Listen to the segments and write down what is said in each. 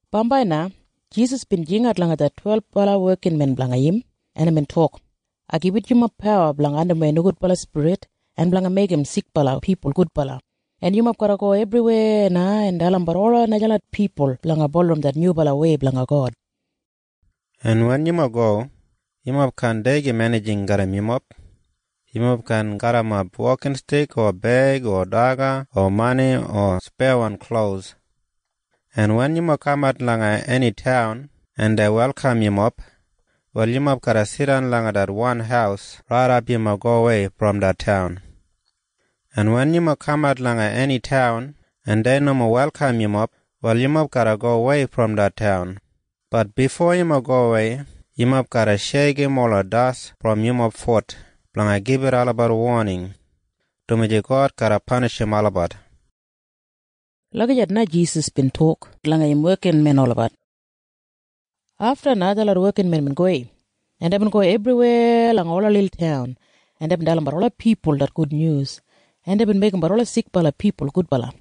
Bambai na Jisas bin jingat langa det twelbala wekinmen blanga im, en imbin tok, “Ai gibit yumob pawa blanga andimwei nogudbala spirit en blanga meigim sikbala pipul gudbala. En yumob garra go ebriweya na en dalimbat ola najalot pipul blanga bulurrum det nyubalawei blanga God. En wen yumob go, yumob kaan deigim enijing garram yumob. Yumob kaan garrimap wokinstik o beig o daga o mani o speyawan klos. En wen yumob kamat langa eni taun en dei welkam yumob, wal yumob garra jidan langa det wan haus raidap yumob gowei brom det taun. En wen yumob kamat langa eni taun en dei nomo welkam yumob, wal yumob garra gowei brom det taun. Bat bifo yumob gowei, yumob garra sheikim ola das brom yumob fut blanga gibit olabat woning, dumaji God garra panishim olabat.” Lagijat na Jisas bin tok langa im wekinmen olabat. Afta na detlot wekinmen bin gowei, en deibin go ebriweya langa ola lilwan taun, en deibin dalimbat ola pipul det gudnyus, en deibin meigimbat ola sikbala pipul gudbala.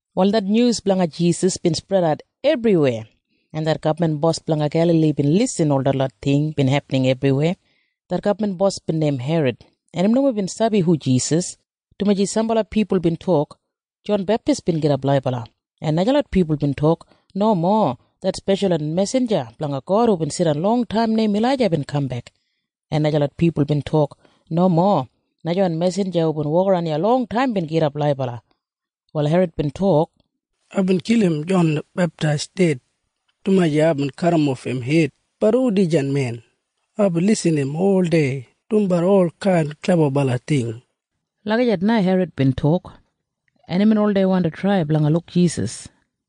Wal det nyus blanga Jisas bin spredat ebriweya, en det gabman bos blanga Gelali bin irrim ol detlot ting bin hepining ebriweya. Det gabman bos bin neim Herod, en im nomo bin sabi hu Jisas, dumaji sambala pipul bin tok, “Jon Beptis bin gidap laibala.” En najalot pipul bin tok, “Nomo. Det speshalwan mesinja blanga God hubin jidan longtaim neim Ilaija bin kambek.” En najalot pipul bin tok, “Nomo. Najawan mesinja hubin wokaran iya longtaim bin gidap laibala.” Wal Herod bin tok, “Aibin kilim Jon Beptis ded, dumaji aibin kadimof im hed. Bat hu dijan men? Aibin irrim im oldei dumbat olkain klebabala ting.” Lagijat na Herod bin tok. En imbin oldei wandi trai blanga luk Jisas.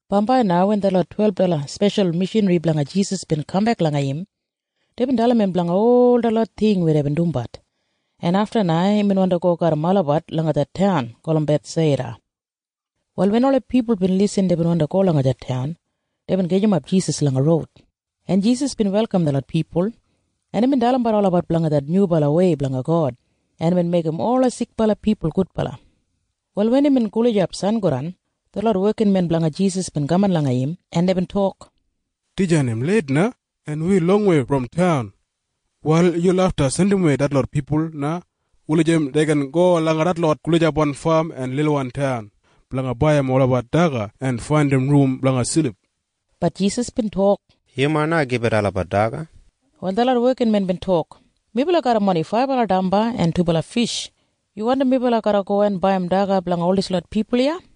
Bambai na wen detlot twelbala speshalwan mishanri blanga Jisas bin kambek langa im, deibin dalim im blanga ol detlot ting weya deibin dumbat, en afta imbin wandi go garram olabat langa det taun gulum Bethsaida. Wal wen ola pipul bin irrim deibin wandi go langa det taun, deibin gajimap Jisas langa roud, en Jisas bin welkam detlot pipul, en imbin dalimbat olabat blanga det nyubalawei blanga God, en imbin meigim ola sikbala pipul gudbala. Wal wen imbin gulijap sangodan, detlot wekinmen blanga Jisas bin kaman langa im, en deibin tok, “Dijan im leit na, en wi longwei brom taun. Wal yu lafta jandimwei detlot pipul na wulijim dei gin go langa detlot gulijapwan fam en lilwan taun blanga baiyim olabat daga en faindim rum blanga silip.” Bat Jisas bin tok, “Yumob na gibit olabat daga.” Wal detlot wekinmen bin tok, “Melabat garram oni faibala damba en dubala fish! Yu wandim melabat garra go en baiyim daga blanga ol dislot pipul iya?”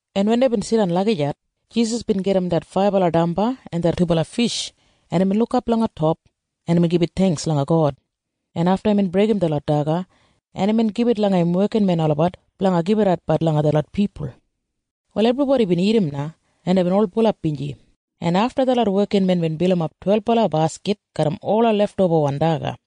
en wen deibin jidan lagijat, Jisas bin gajim det faibala damba en det dubala fish, en imbin lukap langa top, en imbin gibit theingks langa God, en afta imbin breigim detlot daga, en imbin gibit langa im wekinmen olabat blanga gibitatbat langa detlot pipul. Wal ebribodi bin dagat na, en deibin ol sedisfaid, en afta detlot wekinmen bin bilimap twelbala baskit garram ola leftobawan daga.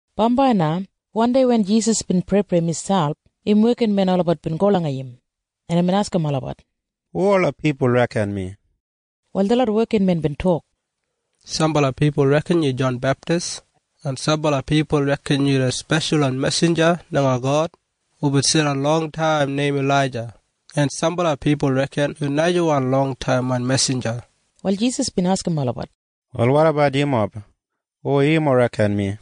Bambai na wandei wen Jisas bin preiprei miselp, im wekinmen olabat bin go langa im, en imbin askim olabat, “Hu ola pipul reken mi?” Wal detlot wekinmen bin tok, “Sambala pipul reken yu Jon Beptis, en sambala pipul reken yu det speshalwan mesinja blanga God hubin jidan longtaim neim Ilaija, en sambala pipul reken yu najawan longtaimwan mesinja.” Wal Jisas bin askim olabat, “Wal wotabat yumob? Hu yumob reken mi?”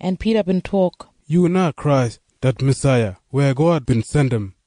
En Pida bin tok, “Yu na Krais det Masaiya weya God bin jandim.”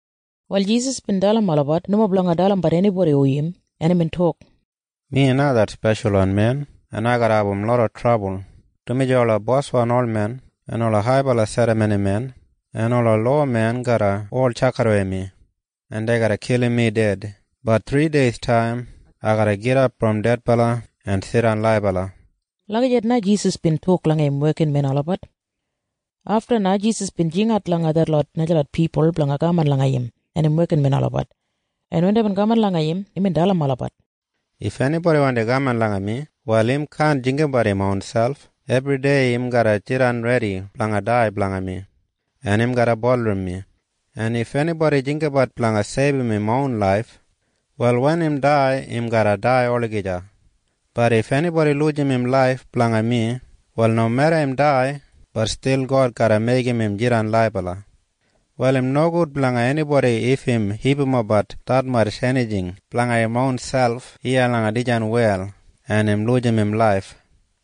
Wal Jisas bin dalim olabat nomo blanga dalimbat enibodi hu im, en imbin tok, “Mi na det Speshalwan Men, en ai garra abum loda trabul, dumaji ola boswan olmen en ola haibala serramonimen en ola lowamen garra ol tjakidawei mi, en dei garra kilim mi ded. Bat thrideistaim ai garra gidap brom dedbala en jidan laibala.” Lagijat na Jisas bin tok langa im wekinmen olabat. Afta na Jisas bin jingat langa detlot najalot pipul blanga kaman langa im en im wekinmen olabat, en wen deibin kaman langa im, imbin dalim olabat, “If enibodi wandi kaman langa mi, wal im kaan jinggabat im ronselp. Ebridei im garra jidan redi blanga dai blanga mi, en im garra bulurrum mi. En if enibodi jinggabat blanga seibum im ron laif, wal wen im dai, im garra dai olagija. Bat if enibodi lujim im laif blanga mi, wal nomeda im dai, bat stil God garra meigim im jidan laibala. “Wal im nogud blanga enibodi if im hipimapbat detmatj enijing blanga im ronselp iya langa dijan wel en im lujim im laif.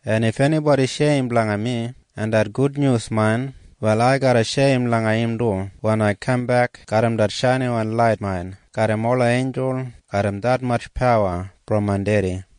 En if enibodi sheim blanga mi en det gudnyus main, wal ai garra sheim langa im du wen ai kambek garram det shainiwan lait main garram ola einjul garram detmatj pawa brom main Dedi.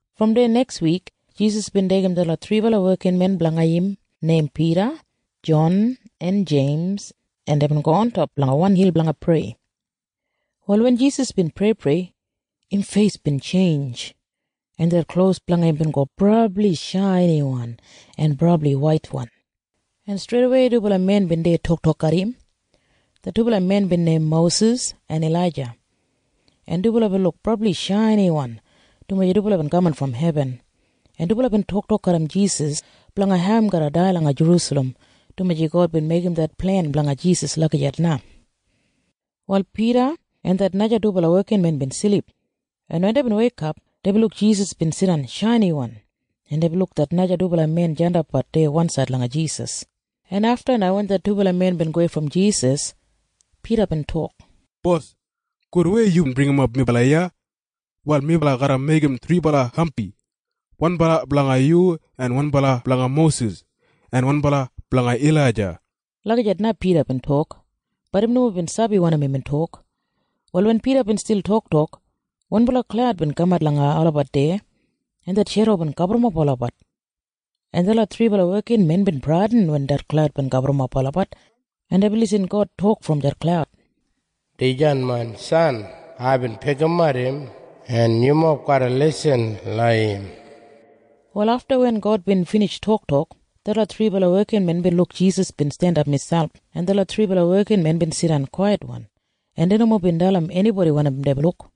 Brom deya nekswik Jisas bin deigim detlot thribala wekinmen blanga im neim Pida, Jon en Jeims, en deibin go ontop langa wan hil blanga prei. Wal wen Jisas bin preiprei, im feis bin tjeinj, en det klos blanga im bin go brabli shainiwan en brabli waitwan, en streidawei dubala men bin deya toktok garram im. Det dubala men bin neim Mosis en Ilaija, en dubala bin luk brabli shainiwan, dumaji dubala bin kaman brom hebin, en dubala bin toktok garram Jisas blanga hau im garra dai langa Jerusalem, dumaji God bin meigim det plen blanga Jisas lagijat na. Wal Pida en det naja dubala wekinmen bin silip, en wen deibin weikap, deibin luk Jisas bin jidan shainiwan, en deibin luk det naja dubala men jandapbat deya wansaid langa Jisas, en afta wen det dubala men bin gowei brom Jisas, Pida bin tok, “Bos, gudwei yubin bringimap melabat iya. Wal melabat garra meigim thribala hampi. Wanbala blanga yu en wanbala blanga Mosis en wanbala blanga Ilaija.” Lagijat na Pida bin tok, bat im nomo bin sabi wanim imbin tok. Wal wen Pida bin stil toktok, wanbala klaud bin kamat langa olabat deya, en det shedo bin gaburrumap olabat, en detlot thribala wekinmen bin bradin wen det klaud bin gaburrumap olabat, en deibin irrim God tok brom det klaud, “Dijan main san. Aibin pikimat im, en yumob garra lisin langa im.” Wal afta wen God bin binij toktok, detlot thribala wekinmen bin luk Jisas bin jandap miselp. En detlot thribala wekinmen bin jidan kwaitwan, en dei nomo bin dalim enibodi wanim deibin luk.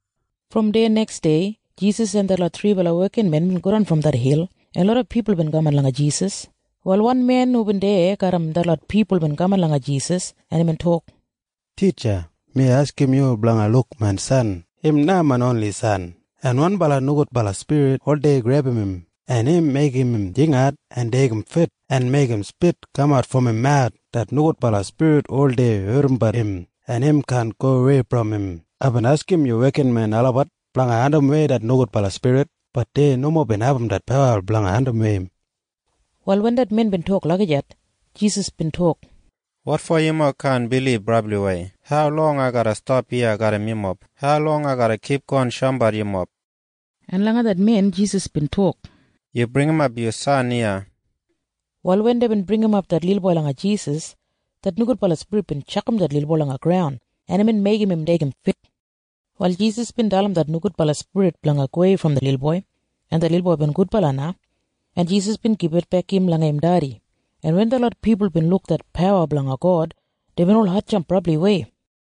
Brom deya neksdei Jisas en detlot thribala wekinmen bin godan brom det hil, en loda pipul bin kaman langa Jisas. Wal wan men hubin deya garram detlot pipul bin kaman langa Jisas, en imbin tok, “Titja, mi askim yu blanga luk main san. Im na main oni san. En wanbala nogudbala spirit oldei grebum im, en im meigim im jingat en deigim fit, en im meigim spit kamat brom im mawus. Det nogudbala spirit oldei ardimbat im, en im kaan gowei brom im. Aibin askim yu wekinmen olabat blanga andimwei det nogudbala spirit. Bat dei nomo bin abum det pawa blanga andimwei im.” Wal wen det men bin tok lagijat, Jisas bin tok, “Wotfo yumob kaan bilib brabliwei? Haulong ai garra stap iya garram yumob? Haulong ai garra kipgon shoumbat yumob?” En langa det men Jisas bin tok, “Yu bringimap yu san iya.” Wal wen deibin bringimap det lilboi langa Jisas, det nogudbala spirit bin tjakam det lilboi langa graun, en imbin meigim im deigim fit. Wal Jisas bin dalim det nogudbala spirit blanga gowei brom det lilboi, en det lilboi bin gudbala na, en Jisas bin gibitbek im langa im dedi, en wen detlot pipul bin luk det pawa blanga God, deibin ol hatjamp brabliwei.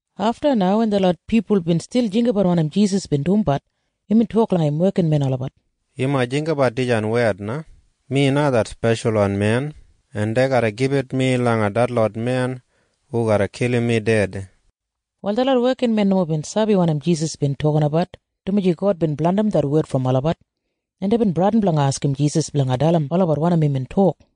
Afta na wen detlot pipul bin stil jinggabat wanim Jisas bin dumbat, imbin tok langa im wekinmen olabat, “Yumob jinggabat dijan wed na. Mi na det Speshalwan Men, en dei garra gibit mi langa detlot men hu garra kilim mi ded.” Wal detlot wekinmen nomo bin sabi wanim Jisas bin tokinabat, dumaji God bin blandim det wed brom olabat, en deibin bradin blanga askim Jisas blanga dalim olabat wanim imbin tok.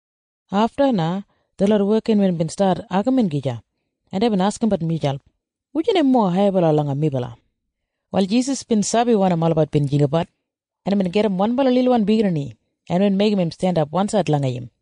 Afta na detlot wekinmen bin stat agamin gija, en deibin askimbat miselp, “Wujan im mowa haibala langa melabat?” Wal Jisas bin sabi wanim olabat bin jinggabat, en imbin gajim wanbala lilwan biginini, en imbin meigim im jandap wansaid langa im,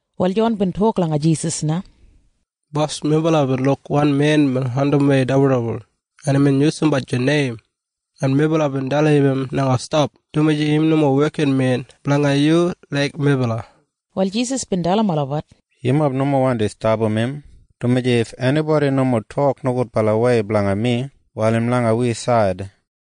Wal Jon bin tok langa Jisas na, “Bos, melabat bin luk wan men bin andimwei dibuldibul, en imbin yusumbat yu neim. En melabat bin dalim im blanga stap, dumaji im nomo wekinmen blanga yu laik melabat.” Wal Jisas bin dalim olabat, “Yumob nomo wandi stapam im, dumaji if enibodi nomo tok nogudbalawei blanga mi, wal im langa wi said.”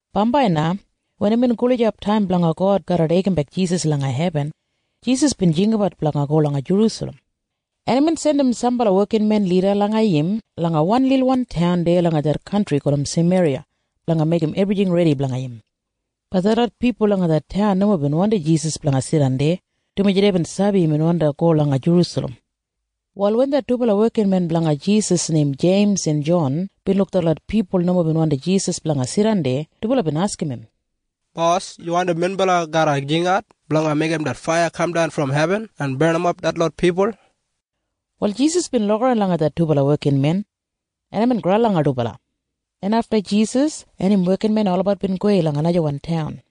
Bambai na wen imbin gulijap taim blanga God garra deigimbek Jisas langa hebin, Jisas bin jinggabat blanga go langa Jerusalem, en imbin jandim sambala wekinmen lida langa im langa wan lilwan taun deya langa det kantri gulum Sameriya blanga meigim ebrijing redi blanga im. Bat detlot pipul langa det taun nomo bin wandim Jisas blanga jidan deya, dumaji deibin sabi imbin wandi go langa Jerusalem. Wal wen det dubala wekinmen blanga Jisas neim Jeims en Jon bin luk detlot pipul nomo bin wandim Jisas blanga jidan deya, dubala bin askim im, “Bos, yu wandim minbala garra jingat blanga meigim faiya kamdan brom hebin en barnimap dislot pipul?” Wal Jisas bin lukaran langa det dubala wekinmen, en imbin graul langa dubala, en afta im en im wekinmen olabat bin gowei langa najawan taun.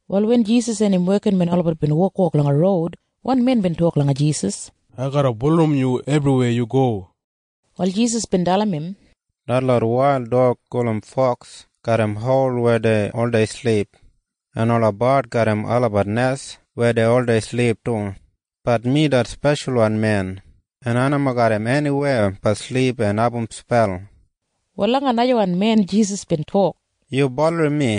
Wal wen Jisas en im wekinmen olabat bin wokwok langa roud, wan men bin tok langa Jisas, “Ai garra bulurrum yu ebriweya yu go.” Wal Jisas bin dalim im, “Detlot wail dog gulum foks garram hol weya dei oldei silip. En ola bard garram olabat nes weya dei oldei silip du. Bat mi det Speshalwan Men, en ai nomo garram eniweya blanga silip en abum spel.” Wal langa najawan men Jisas bin tok, “Yu bulurrum mi.”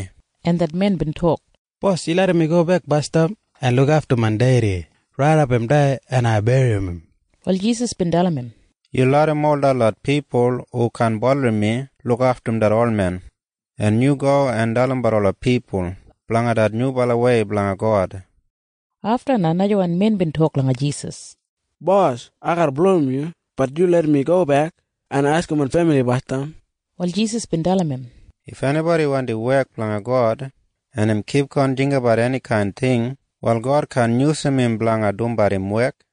En det men bin tok, “Bos, yu larram mi gobek basdam en lukaftum main dedi raidap im dai en ai berrim im.” Wal Jisas bin dalim im, “Yu larram ol detlot pipul hu kaan bulurrum mi lukaftum det olmen, en yu go en dalimbat ola pipul blanga det nyubalawei blanga God.” Afta na najawan men bin tok langa Jisas, “Bos, ai garra bulurrum yu. Bat yu larram mi gobek en askim main femili basdam.” Wal Jisas bin dalim im, “If enibodi wandi wek blanga God, en im kipgon jinggabat enikain ting, wal God kaan yusum im blanga dumbat im wek.”